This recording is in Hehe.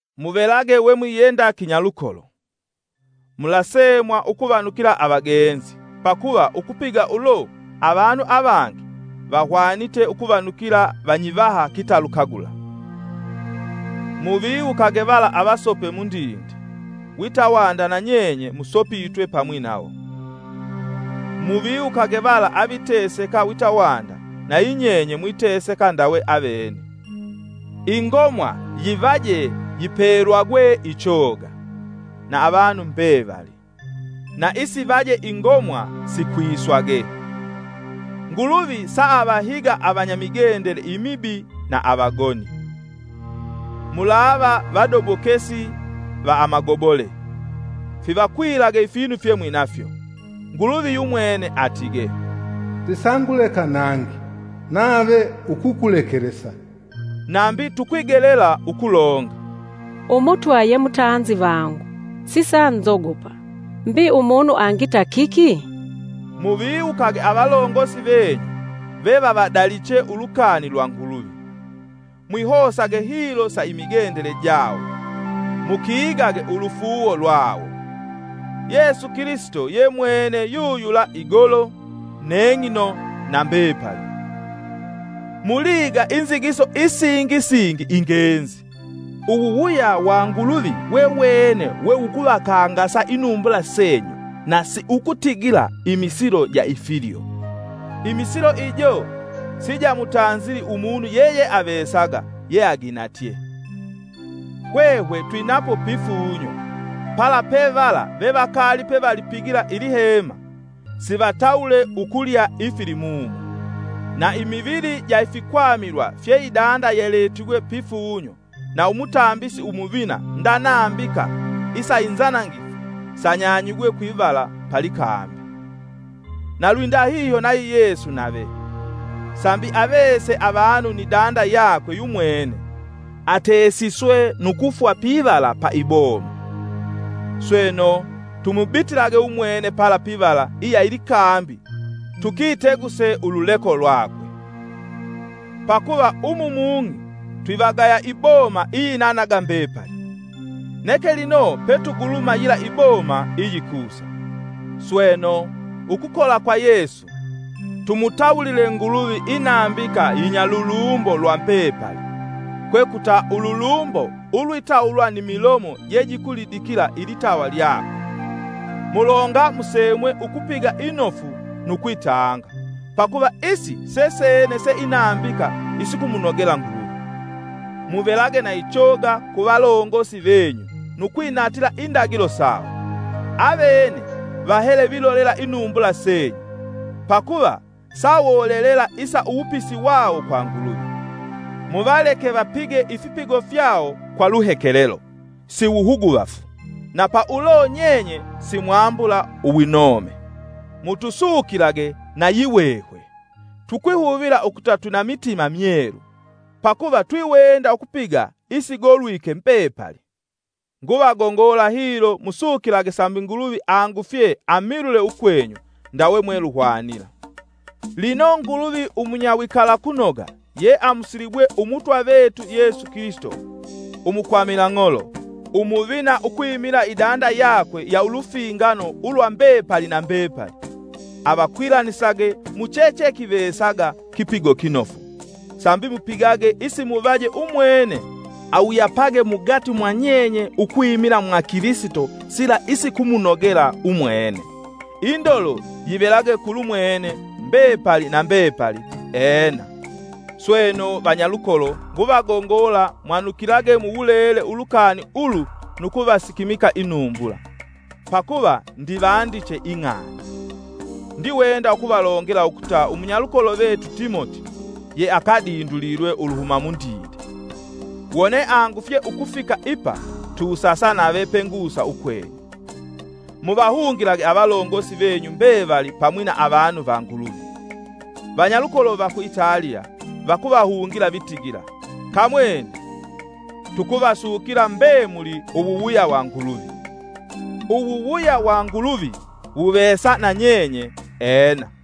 Muvelage we mwiyenda kinyalukolo. Mulasemwa ukuvanukila avagenzi; pakuva ukupiga ulo, avanu avangi vahwanite ukuvanukila vanyivaha kitalukagula. Muviwukage vala avasope mundinde wita wanda nanyenye musopitwe pamwi nawo. Muviwukage vala aviteseka wita wanda nayinyenye mwiteseka ndawe avene. Ingomwa yivaje yipelwagwe ichoga, na avanu mbevali, na isivaje ingomwa sikwiswage. Nguluvi saavahiga avanya migendele imibi na avagoni. Mulava vadobokesi va amagobole; fivakwilage ifinu fyemwinafyo. Nguluvi yumwene atige, “Sisanguleka nangi, nave ukukulekelesa.” Nambi tukwigelela ukulonga: “Umutwa ye mutanzi vangu, sisanzogopa. Mbi umunu angita kiki?” Muviwukage avalongosi venyu vevavadaliche ulukani lwa Nguluvi. Mwihosage hilo sa imigendele jawo, mukigage ulufuuwo lwawo. Yesu Kilisito ye mwene yuyula igolo, neng'ino na mbepali. Muliiga inzigiso isingi singi ingenzi. Uwuwuya wa Nguluvi wewene we wukuvakangasa inumbula senyu na siukutigila imisilo ja ifilyo; imisilo ijo sijamutanzili umunu yeyeavesaga yeaginatye. Hwehwe twinapo pifunyo pala pevala vevakali pevalipigila ilihema, sivatawule ukulya ifilimumo. Na imivili ja ifikwamilwa fye idanda yaletigwe pifunyo na umutambisi umuvina nda nambika isa inzanangifu sanyanyigwe kwivala pa likambi. Na lwindahihyo nayi Yesu nave, sambi avese avanu ni danda yakwe yumwene, atesiswe nu kufwa pivala pa iboma. Sweno, tumubitilage umwene pala pivala iya ilikambi tukiteguse ululeko lwakwe. Pakuva umu mung'i twivagaya iboma iyinanaga mbepali; neke lino petuguluma yila iboma iyikusa. Sweno, ukukola kwa Yesu, tumutawulile Nguluvi inambika yinya lulumbo lwa mbepali, kwekuta ululumbo ulwitawulwa ni milomo jejikulidikila ilitawa lyakwe. Mulonga musemwe ukupiga inofu nu kwitanga, pakuva isi sesene se inambika isikumunogela Nguluvi. Muvelage na ichoga ku valongosi venyu nu kwinatila indagilo sawo; avene vahele vilolela inumbula senyu, pakuva sawolelela isa uwupisi wawo kwa Nguluvi. Muvaleke vapige ifipigo fyawo kwa luhekelelo, si wuhuguvafu, na pa ulo nyenye simwambula uwinome. Mutusukilage na yihwehwe. Tukwihuvila ukuta twina mitima myelu, pakuva twiwenda ukupiga isigolwike mbepali. Nguvagongola hilo musukilage sambi Nguluvi angufye amilule ukwenyu ndawe mweluhwanila. Lino Nguluvi umunyawikalakunoga ye amusilibwe Umutwa vetu Yesu Kilisito umukwamila-ng'olo umuvina ukwimila idanda yakwe va ulufingano ulwa mbepali na mbepali, avakwilanisage muchechekivesaga kipigo kinofu, sambi mupigage isimuvaje umwene awuyapage mugati mwa nyenye, ukwimila mwa Kilisito sila isikumunogela umwene. Indolo yivelage kulu mwene, mbepali na mbepali! Ena. Sweno, vanyalukolo, nguvagongola mwanukilage mu wulele ulukani ulu nu kuvasikimika inumbula, pakuva ndivandiche ing'ani. Ndiwenda ukuvalongela ukuta umunyalukolo vetu Timoti ye akadindulilwe uluhuma mundinde. Wone angufye ukufika ipa, tusasa nave pengusa ukwenyu. Muvahungilage avalongosi venyu mbevali pamwi na avanu va Nguluvi! Vanyalukolo va ku Italiya vakuvahungila vitigila, Kamwene. Tukuvasukila mbemuli uwuwuya wa Nguluvi. Uwuwuya wa Nguluvi wuvesa na nyenye Ena.